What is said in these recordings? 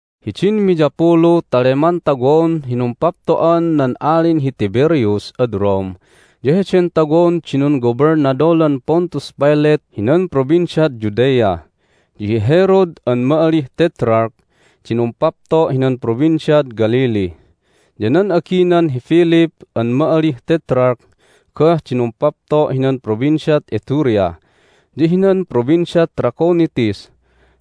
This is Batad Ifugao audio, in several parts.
Hidin miyapulu ta leman tawon hi numpapto'an nan Alin hi Tiberius ad Rome ya heden tawon di nunggobelnadolan Pontius Pilate hinan Provinciad Judea, ya hi Herod an ma'alih Tetrarch di numpapto' hinan Provinciad Galilee. Ya nan aginan hi Philip an ma'alih Tetrarch goh di numpapto' hinan Provinciad Iturea ya hinan Provinciad Trachonitis,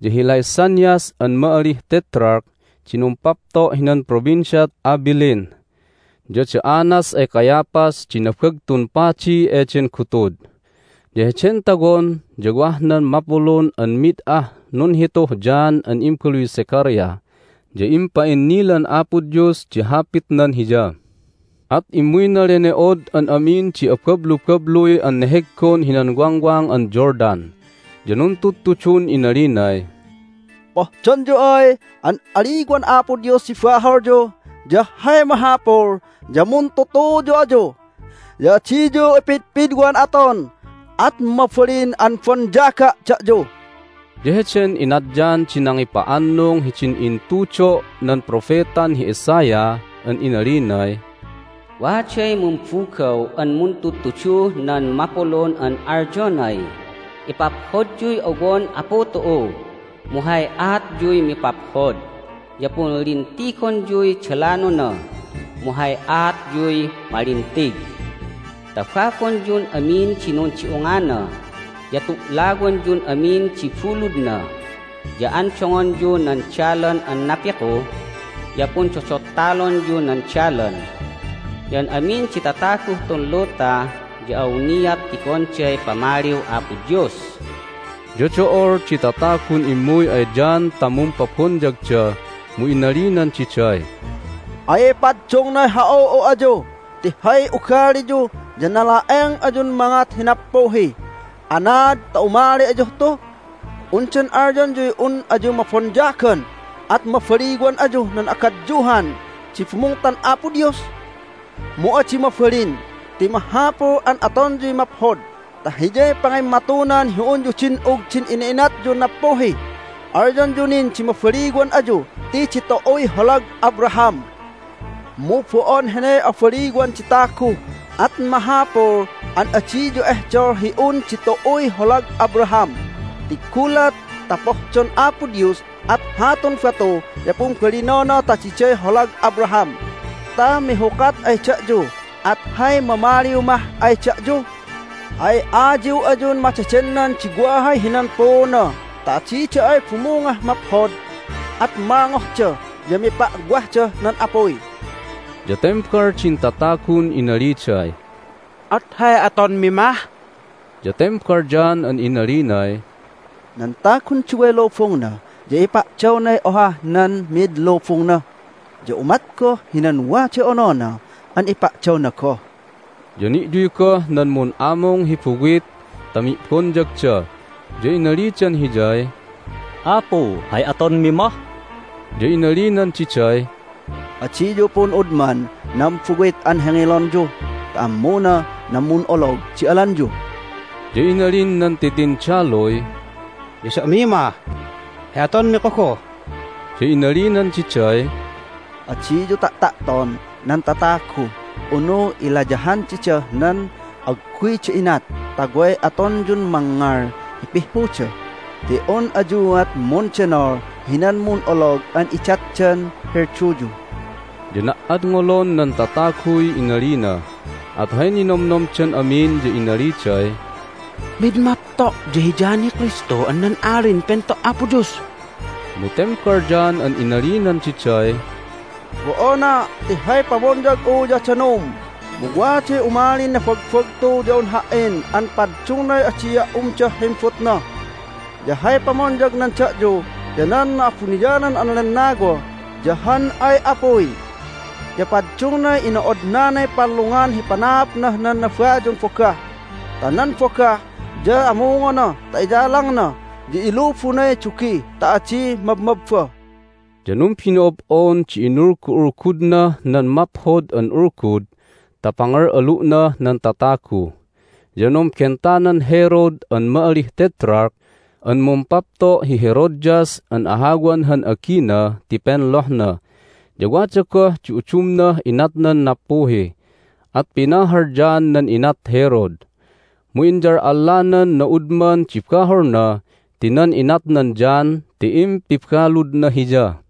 ya hi Lysanias an ma'alih Tetrarch di numpapto' hinan Provinciad Abilene. Ya da Annas ay Caiaphas di Nabagtun Padi eden gutud. Ya heden tawon ya wah nan mapulun an mid ah nunhituh John an imbaluy Zechariah, ya impa'innilan Apo Dios di Hapitnan hiya. At immuyna lene'od an amin di abablubabluy an neheggon hinan Wangwang an Jordan. Ya nuntudtudun inalinay, "Pohdonyu ay an aliwan Apo Dios di baholyu ya hay mahapul ya muntutuyu ayu, ya adiyu ipidpidwan aton, at mabalin an bonyaga' da'yu." Ya heden inat John di nangipa'annung hidin intudo' nan propetan hi Isaiah an inalinay, "Waday mumbugaw an muntudtuduh nan mapulun an alyonay, Ipaphodyuy owon Apu tu'u, mu hay aatyuy mipaphod, ya punlintigonyuy dalanona, mu hay aatyuy malintig! Tababonyun amin di nundi'ungana, ya tu'lawanyun amin di buludna. Ya andongonyu nan dalan an napiku, ya pundodottalonyu nan dalan. Ya an amin di tataguh tun luta ya awniat tigonday pamaliw Apo Dios!" Ya do'ol di tatagun immuy ay John ta mumpabonyagda, mu inalinan diday, "Ay paddungnay ha'u'u ayu ti hay ugaliyu ya nala'eng ayun mangat hi nappuhi! Anaad ta umali ayuh tu? Undan alyonyuy un ayu mabonyagan at mabaliwan ayuh nan agadyuhan di bumungtan Apo Dios? Mu adi mabalin! Ti mahapul an atonyuy maphod ta hiyay pangimmatunan hi unyu din'ug din ina'inatyun nappuhi! Alyonyu nin di mabaliwan ayu ti ditu'uy holag Abraham. Mu bo'on heney abaliwan di tagu, at mahapul an adiyu ehdol hi un ditu'uy holag Abraham. Ti gulat ta pohdon Apo Dios at hatun batu ya pumbalinona ta diday holag Abraham ta mihukat ay da'yu! At hay mamaliw mah ay da'yu? Ay ayiw ayun madedennan di wahay hinan puuna ta adida ay bumungah maphod at malngohda, ya mipa'wahdah nan apuy." Ya tembal din tatagun inaliday, "At hay atonmi mah?" Ya tembal John an inalinay, "Nan tagun duway lubungna ya impa'dawnay ohah nan mi'id lubungna, ya umat goh hinan waday onona an ipa'dawna goh." Ya ni'yuy goh nan mun'amung hi buwit ta mi'bonyagda, ya inalidan hiyay, "Apu, hay atonmi mah?" Ya inalinan diday, "Adiyu pun'udman nan buwit an hengelonyu ta ammuna nan mun'olog di alanyu." Ya inalin nan titindaluy, "Ya da'mi mah, hay atonmi kogoh?" Ya inalinan diday, "Adiyu ta'ta'ton nan tatagu unu ilayahan didah nan agguyda inat ta way atonyun mangngal hi pihhuda, ti un ayuat mundenol hinan mun'olog an idatdan hilduyu." Ya na"adngolon nan tataguy inalina, at hay ninomnomdan amin ya inaliday, "Mid mapto' ya hi John hi Kristu an nan Alin Pento' Apo Dios!" Mu tembal John an inalinan diday, "Bo'ona'! Ti hay pamonyag'u ya danum, mu waday umalin nabagbagtu ya un ha"in an paddungnay adia' umdah himbutna. Ya hay pamonyagnan da'yu ya nan Na'abuniyanan an Lennawa ya han ay apuy. Ya paddungnay ino'odnanay pallungan hi panaapnah nan nabayun bogah ta nan bogah ya amungona ta iyalangna, ya ilubunay dugi ta adi mabmabba!" Ya numbino'ob'on di inulgu'ulgudnah nan Maphod an Ulgud ta pangal'alu'nah nan tatagu. Ya numbentanan Herod an ma'alih Tetrarch an mumpapto' hi Herodias an ahawan han agina ti penlohna, ya wada goh di udumnah inatnan nappuhi. At pinahal John nan inat Herod. Mu inyal'allanan na'udman di baholna ti nan inatnan John ti impibaludna hiya.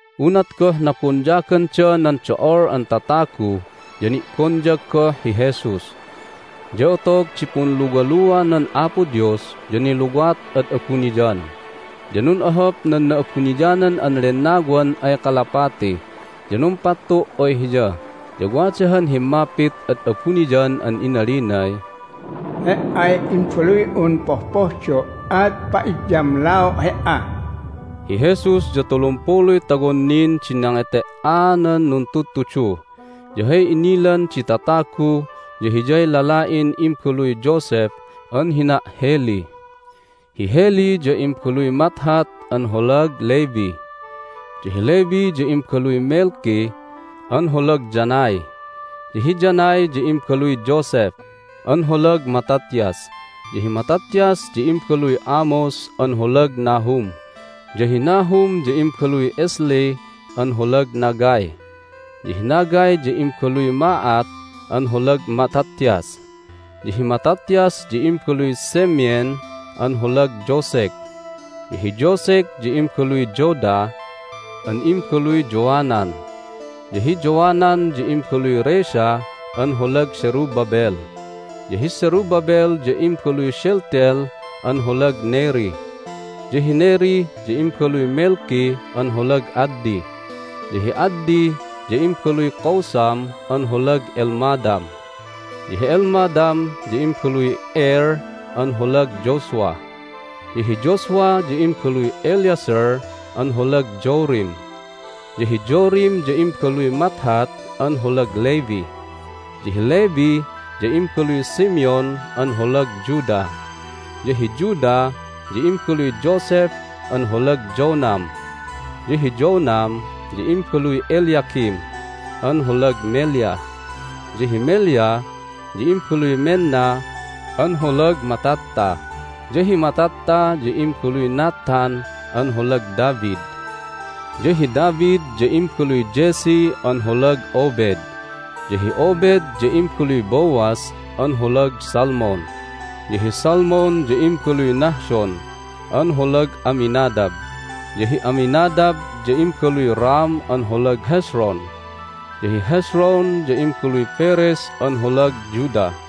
Unat goh nabonyaganda nan do'ol an tatagu ya ni'bonyag goh hi Jesus. Ya otog di punluwaluanan Apo Dios ya niluwat ad abuniyan, ya nun'ohop nan Na'abuniyanan an Lennawan ay kalapati, ya numpattu' ay Hiya. Ya wada han himmapit ad abuniyan an inalinay, "He"ay Imbaluy'un pohpohdo', at pa'idyamlao' He"a." Hi Jesus ya tulumpuluy tawon nin di nangete"aanan nuntudtudu. Ya hay inilan di tatagu ya Hiyay lala'in imbaluy Joseph an hina' Heli. Hi Heli ya imbaluy Matthat an holag Levi, ya hi Levi ya imbaluy Melki an holag Jannai, ya hi Jannai ya imbaluy Joseph an holag Mattathias, ya hi Mattathias ya imbaluy Amos an holag Nahum, ya hi Nahum ya imbaluy Esli an holag Naggai. Ya hi Naggai ya imbaluy Maath an holag Mattathias, ya hi Mattathias ya imbaluy Semein an holag Josek, ya hi Josek ya imbaluy Joda an imbaluy Joanan, ya hi Joanan ya imbaluy Rhesa an holag Zerubbabel, ya hi Zerubbabel ya imbaluy Shealtiel an holag Neri. Ya hi Neri ya imbaluy Melki an holag Addi, ya hi Addi ya imbaluy Cosam an holag Elmadam, ya hi Elmadam ya imbaluy Er an holag Joshua, ya hi Joshua ya imbaluy Eliezer an holag Jorim, ya hi Jorim ya imbaluy Matthat an holag Levi. Ya hi Levi ya imbaluy Simeon an holag Judah, ya hi Judah ya imbaluy Joseph an holag Jonam, ya hi Jonam ya imbaluy Eliakim an holag Melea, ya hi Melea ya imbaluy Menna an holag Mattatha, ya hi Mattatha ya imbaluy Nathan an holag David. Ya hi David ya imbaluy Jesse an holag Obed, ya hi Obed ya imbaluy Boaz an holag Salmon, ya hi Salmon ya imbaluy Nahshon an holag Amminadab, ya hi Amminadab ya imbaluy Ram an holag Hezron, ya hi Hezron ya imbaluy Perez an holag Judah.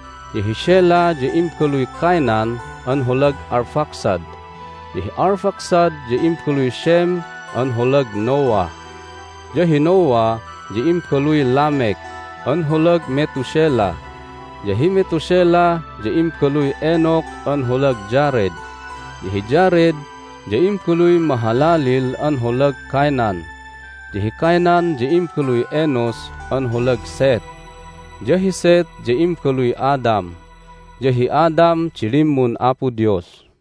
Ya hi Shelah ya imbaluy Cainan an holag Arphaxad, ya hi Arphaxad ya imbaluy Shem an holag Noah, ya hi Noah ya imbaluy Lamek an holag Methuselah, ya hi Methuselah ya imbaluy Enock an holag Jared, ya hi Jared ya imbaluy Mahalaleel an holag Cainan. Ya hi Cainan ya imbaluy Enos an holag Seth, ya hi Seth ya imbaluy Adam, ya hi Adam di limmun Apo Dios.